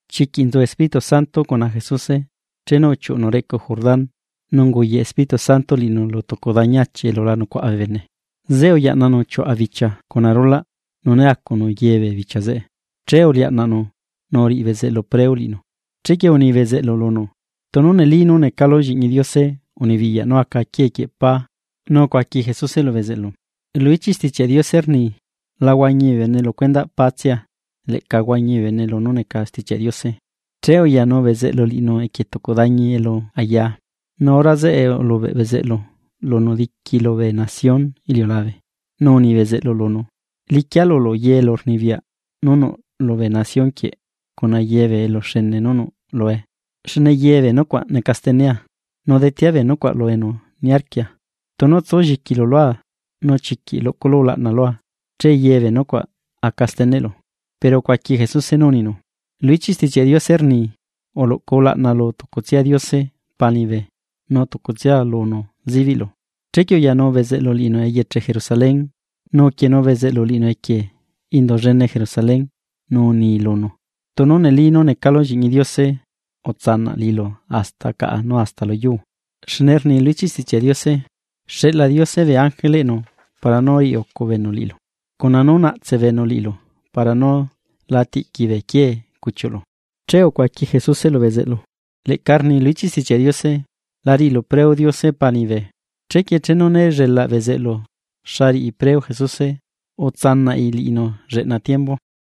Chiquiꞌ nzu Espíritu Santo cuna Jesuse, chenu uchiuꞌnu reꞌcu Jordán, nu unguyaꞌ Espíritu Santo liꞌinu lu tucu dañi achi elu la nucuaꞌa bee bene. Zeꞌe uyaꞌnanu chiuaꞌa bichia cuna rulaꞌ, nu né acunu ye bee bichia zeꞌe. Che uliaꞌnaꞌnu nu uriꞌi bezeꞌlu preo liꞌinu. Chequie uni bezeꞌlu lunu: ―Tunu neli nú necalu Lliꞌñi Diose, unibiyaꞌ nú aca quiee quieꞌ pá. Nu ucuaqui Jesuse lu bezeꞌlu: ―Lu ichiꞌ Stichiaꞌ Diose rni: “La huañi bee bene lu cuendaꞌ pá tsia, leꞌca huañi bee bene lunú neca Stichiaꞌ Diose.” Che uyanu bezeꞌlu liꞌinu equie tucu dañi elu ayaa, nu hora zeꞌe ulubeꞌ bezeꞌlu lunu nzieꞌ bee nación iliulabe, nu uni bezeꞌlu lunu: ―Liquia lulu ye elurnibiyaꞌ nú nuꞌ lubee nación quieꞌ cuna ye bee eluxene nú nuꞌ lue. Xne ye bee nucuaꞌ neca stenea, nu detea bee nucuaꞌ lu enu niarquia. Tunu tsu lliquilu lua nu chiquiꞌ luꞌculu ulaꞌna lua, che ye bee nucuaꞌ aca steneꞌlu. Pero ucuaqui Jesuse nú uninu: ―Lu ichiꞌ Stichiaꞌ Diose rni: “Uluꞌcu ulaꞌna lu tucutsia Diose Pa liñibe, nu tucutsia lunu zibiꞌlu.” Chequie uyanu bezeꞌlu liꞌinu eyeche Jerusalén, nu uquienuu bezeꞌlu liꞌinu equie indu llene Jerusalén nu uni lunu: ―Tunu neli nú necalu Lliꞌñi Diose, utsanaꞌ liꞌilu hasta caꞌa nu hasta lu yuu. Xne rni lu ichiꞌ Stichiaꞌ Diose: Xeꞌla Diose bee ángeleꞌnu para nú riꞌi ucu beenu liꞌilu. Cuna nú naꞌtse beenu liꞌilu, para nú la tiꞌqui bee quiee cuchiuꞌlu. Che ucuaqui Jesuse lu bezeꞌlu: ―Leꞌca rni lu ichiꞌ Stichiaꞌ Diose: “La riꞌilu preo Diose Pa liñibe.” Chequie chenu né llelaꞌ bezeꞌlu xa riꞌi preo Jesuse, utsanaꞌi liꞌinu lleꞌna tiembu.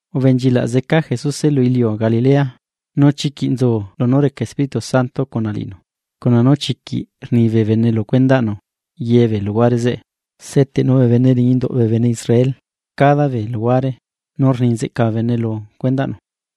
Ubenchilaꞌ zeca Jesuse lu iliu Galilea, nu chiquiꞌ nzu lunú reca Espíritu Santo cuna liꞌinu, cuna nú chiquiꞌ rni bee bene lu cuendaꞌnu ye bee luhuare zeꞌe. Seteꞌnu bee bene liñi induꞌ bee bene Israel cada bee luhuare, nu rni nzeꞌca bee bene lu cuendaꞌnu.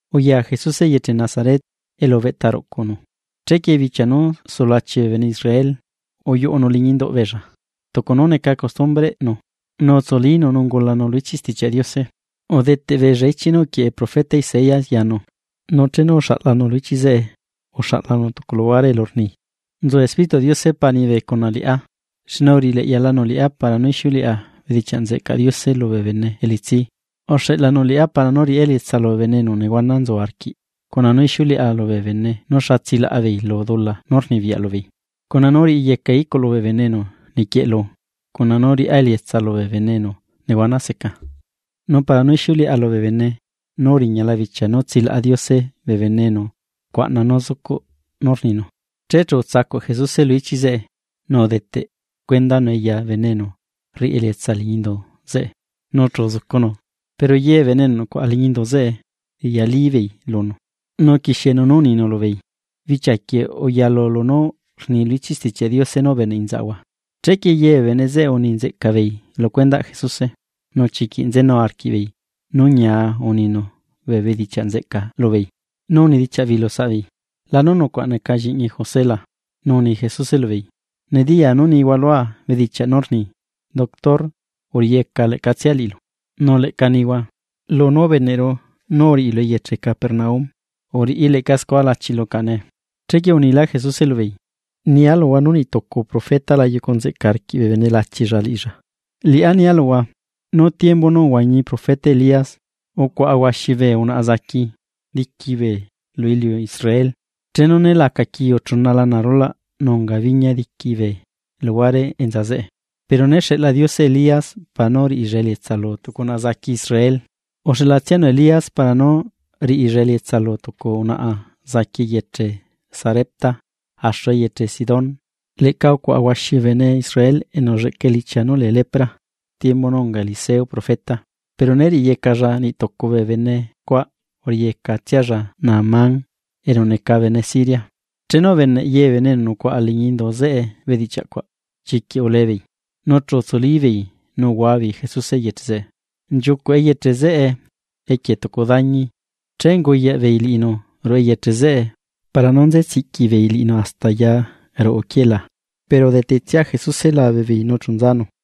Uya Jesuse eyeche Nazaret, elu ubeꞌta ruꞌcunu. Chequie bichia nú sulachi bee bene Israel, uyuꞌunu liñi induꞌ beella tucu nú neca costumbreꞌnu, nu utsulínu nu ungulanu lu ichiꞌ Stichiaꞌ Diose. Udeteꞌ beella ichiꞌ nú uquieꞌe profeta Isaías yanu, nu chenu uxaꞌlanu lu ichiꞌ zeꞌe uxaꞌlanu tucu luhuare elu rni: Nzu Espírituꞌ Diose Pa liñibe cuna liꞌá, xne uriꞌi leꞌyalanu liꞌá para nú ixiuleꞌa bedichiaꞌ nzeꞌcaꞌ Diose lubee bene elitsí; uxeꞌlanu liꞌá para nú riꞌá elietsa lubee bene enu nehuana nzu arquiꞌ, cuna nú ixiuleꞌa lubee bene nú xa tsilaꞌa beei lu dula nú rnibiyaꞌ lubeei, cuna nú riꞌiyecaa iculu bee bene enu niquieꞌlu, cuna nú riꞌá elietsa lubee bene enu nehuana seca. Nu para nú ixiuleꞌa lubee bene nú uriñala bichia nú tsilaꞌa Diose bee bene enu rcuaꞌna nú zucuꞌ nú rninu. Che chu utsacuꞌ Jesuse lu ichiꞌ zeꞌe, nu udeteꞌ cuendanue ya bene enu rriꞌi elietsa liñi indu zeꞌe nu chu uzucunu. Pero ye bee bene enu nucuaꞌa liñi indu zeꞌe riꞌyalí beei lunu. Nu uquixienu nú uninu, lubeei: ―Bichia quieꞌ uyalu lunú rni lu ichiꞌ Stichiaꞌ Diose nú ubeneꞌ inzaꞌhua. Chequie ye bee bene zeꞌe uni nzeꞌca beei lu cuendaꞌ Jesuse, nu chiquiꞌ nzenu arquiꞌbeei nú ñia uninu bee bedichiaꞌ nzeꞌca lubeei. Nu unidichiaꞌ beei lu saꞌbeei: ―¿Lanú nucuaꞌ neca lliꞌñi José la? Nu uni Jesuse lubeei: ―Nediyaa nú nihua lua bedichiaꞌ nú rni: “Doctor uriꞌiyeca leꞌcatsia liꞌilu.” Nu leꞌca nihua: “Lunú ubeneꞌru nú uriꞌilu eyeche Capernaúm, uriꞌi leꞌca scua lachilu caꞌa nee.” Chequie unilá Jesuse lubeei: ―Nia luhua nú niꞌtucu profeta la yucu nzeꞌca arquiꞌ bee bene lachilla liꞌilla. Liꞌá nia luhua, nú tiembu nú uhuañi profeta Elías, ucuaꞌa huaxi bee unaꞌa zaqui diqui bee lu iliu Israel, chenu né laca quiu chuna lana arulaꞌ nu unga biñia diqui bee luhuare enza zeꞌe. Pero né xeꞌla Diose Elías, para nú riꞌilla elietsa lu tucu unaꞌa zaqui Israel, uxeꞌla tsianu Elías para nú riꞌilla elietsa lu tucu unaꞌa zaqui eyeche Sarepta, axu eyeche Sidón. Leꞌca ucuaꞌa huaxi bee bene Israel enu ulleꞌca elichia nú lee lepra tiembu nú unga Eliseo profeta, pero né riꞌiyecalla niꞌ tucu bee bene cuaꞌ, uriyeca tsialla Naamán, enu neca bene Siria. Chenu ubeneꞌ ye bee bene enu nucuaꞌa liñi indu zeꞌe bedichiaꞌ cuaꞌ, chiquiꞌ ulee beei. Nu chu utsuli beei nu uhua beei Jesuse eyeche zeꞌe, nchiucuꞌ eyeche zeꞌe equie tucu dañi, che unguyaꞌ beei liꞌinu ruꞌu eyeche zeꞌe para nú nze tsiꞌqui beei liꞌinu hasta quierquie. Pero udetetsia Jesuse labe beei nu chu nzanu.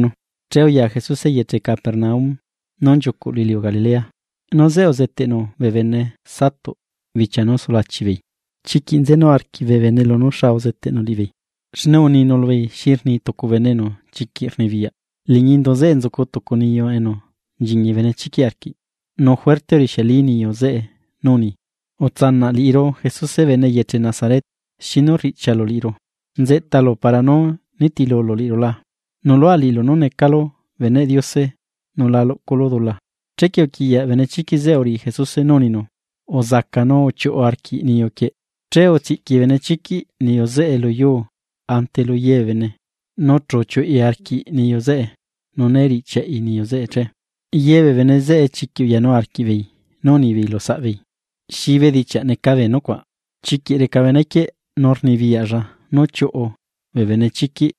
Che uya Jesuse eyeche Capernaúm nú nchiucuꞌ lu iliu Galilea, nu zeꞌe uzeteꞌnu bee bene Satuꞌ bichia nú sulachi beei. Chiquiꞌ nzenu arquiꞌ bee bene lunú xa uzeteꞌnu liꞌibeei, xne uninu lubeei xi rni tucu bene enu chiquiꞌ rnibiyaꞌ. Liñi indu zeꞌe nzucu tucu niyu enu nchiñi benechiquiꞌ arquiꞌ, nu juerte urixiali niyu zeꞌe nú uni: ―¡Utsanaꞌ liꞌiru! Jesuse bene eyeche Nazaret. ¿Xinu riꞌchialu liꞌiru? ¿Nzeꞌtalu para nú nitilulu liꞌiru la? Nuꞌlua liꞌilu nú necalu Beneꞌ Diose nu la luꞌculu dula. Chequie uquiꞌyaꞌ benechiquiꞌ zeꞌe uriꞌi Jesuse nú uninu: ―¡Uzaca nu uchiuꞌu arquiꞌ niyu quieꞌ! Che utsiꞌqui benechiquiꞌ niyu zeꞌe lu yuu ante lu ye bee bene, nu chu uchiuꞌi arquiꞌ niyu zeꞌe nu né riꞌchiaꞌi niyu zeꞌe che. Ye bee bene zeꞌe chiquiꞌ uyanu arquiꞌbeei nú unibeei lu saꞌbeei: ―¿Xi bedichiaꞌ neca bee nucuaꞌ? Chiquiꞌ reca benequieꞌ nu rnibiyaꞌlla nú chiuꞌu bee benechiquiꞌ.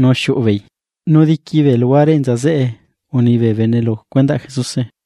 ¡Nu xiuꞌu beei! Nu diqui bee luhuare enza zeꞌe uni bee bene lu cuendaꞌ Jesuse.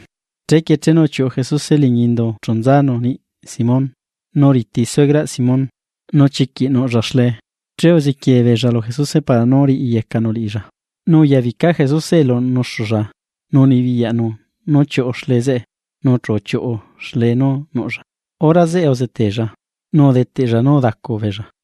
Chequie chenu uchiuꞌu Jesuse liñi indu chu nzanu niꞌi Simón. Nu riti suegraꞌ Simón, nu chiquiꞌ nuꞌlla xlee, che uzequiee beella lu Jesuse para nú riꞌyecanu liꞌilla. Nu uya bica Jesuse elu nuxulla nu unibiyaꞌnu nú chiuꞌu xlee zeꞌe, nu chu uchiuꞌu xlee nú nuꞌlla. Hora zeꞌe uzetella, nu udeteꞌlla nú udacu beella.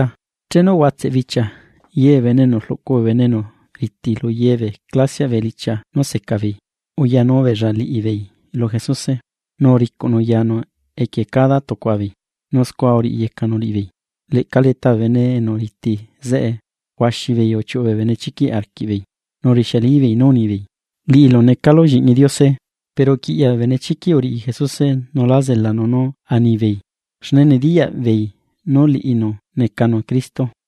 Chenu uhuatseꞌ bichia, ye bee bene enu rluꞌcu bee bene enu riti lu ye bee clasiaꞌ bee elichia nú seca beei uyanu beella liꞌibeei lu Jesuse, nu uricuꞌnu yanu equie cada tucua beei, nu scua uriyecanu liꞌibeei. Leꞌca leta bee bene enu riti zeꞌe huaxi beei uchiuꞌu bee benechiquiꞌ arquiꞌbeei, nu urixialibeei nú unibeei: ―¡Liꞌilu necalu Lliꞌñi Diose! Pero uquiꞌyaꞌ bee benechiquiꞌ uriꞌi Jesuse nu lá zelanu nú anibeei, xne nediyaꞌbeei nú liꞌinu necanu Cristo.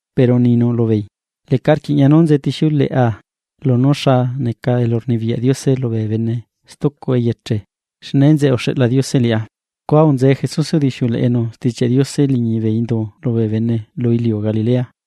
pero uninu lubeei: ―Leꞌca rquiꞌña nú nzetixiuleꞌa lunú xa neca elurnibiyaꞌ Diose lubee bene stucu eyeche, xne enzeꞌe uxeꞌla Diose liꞌá. Scua unzee Jesuse udixiuleꞌenu Stichiaꞌ Diose liñi bee indu lubee bene lu iliu Galilea.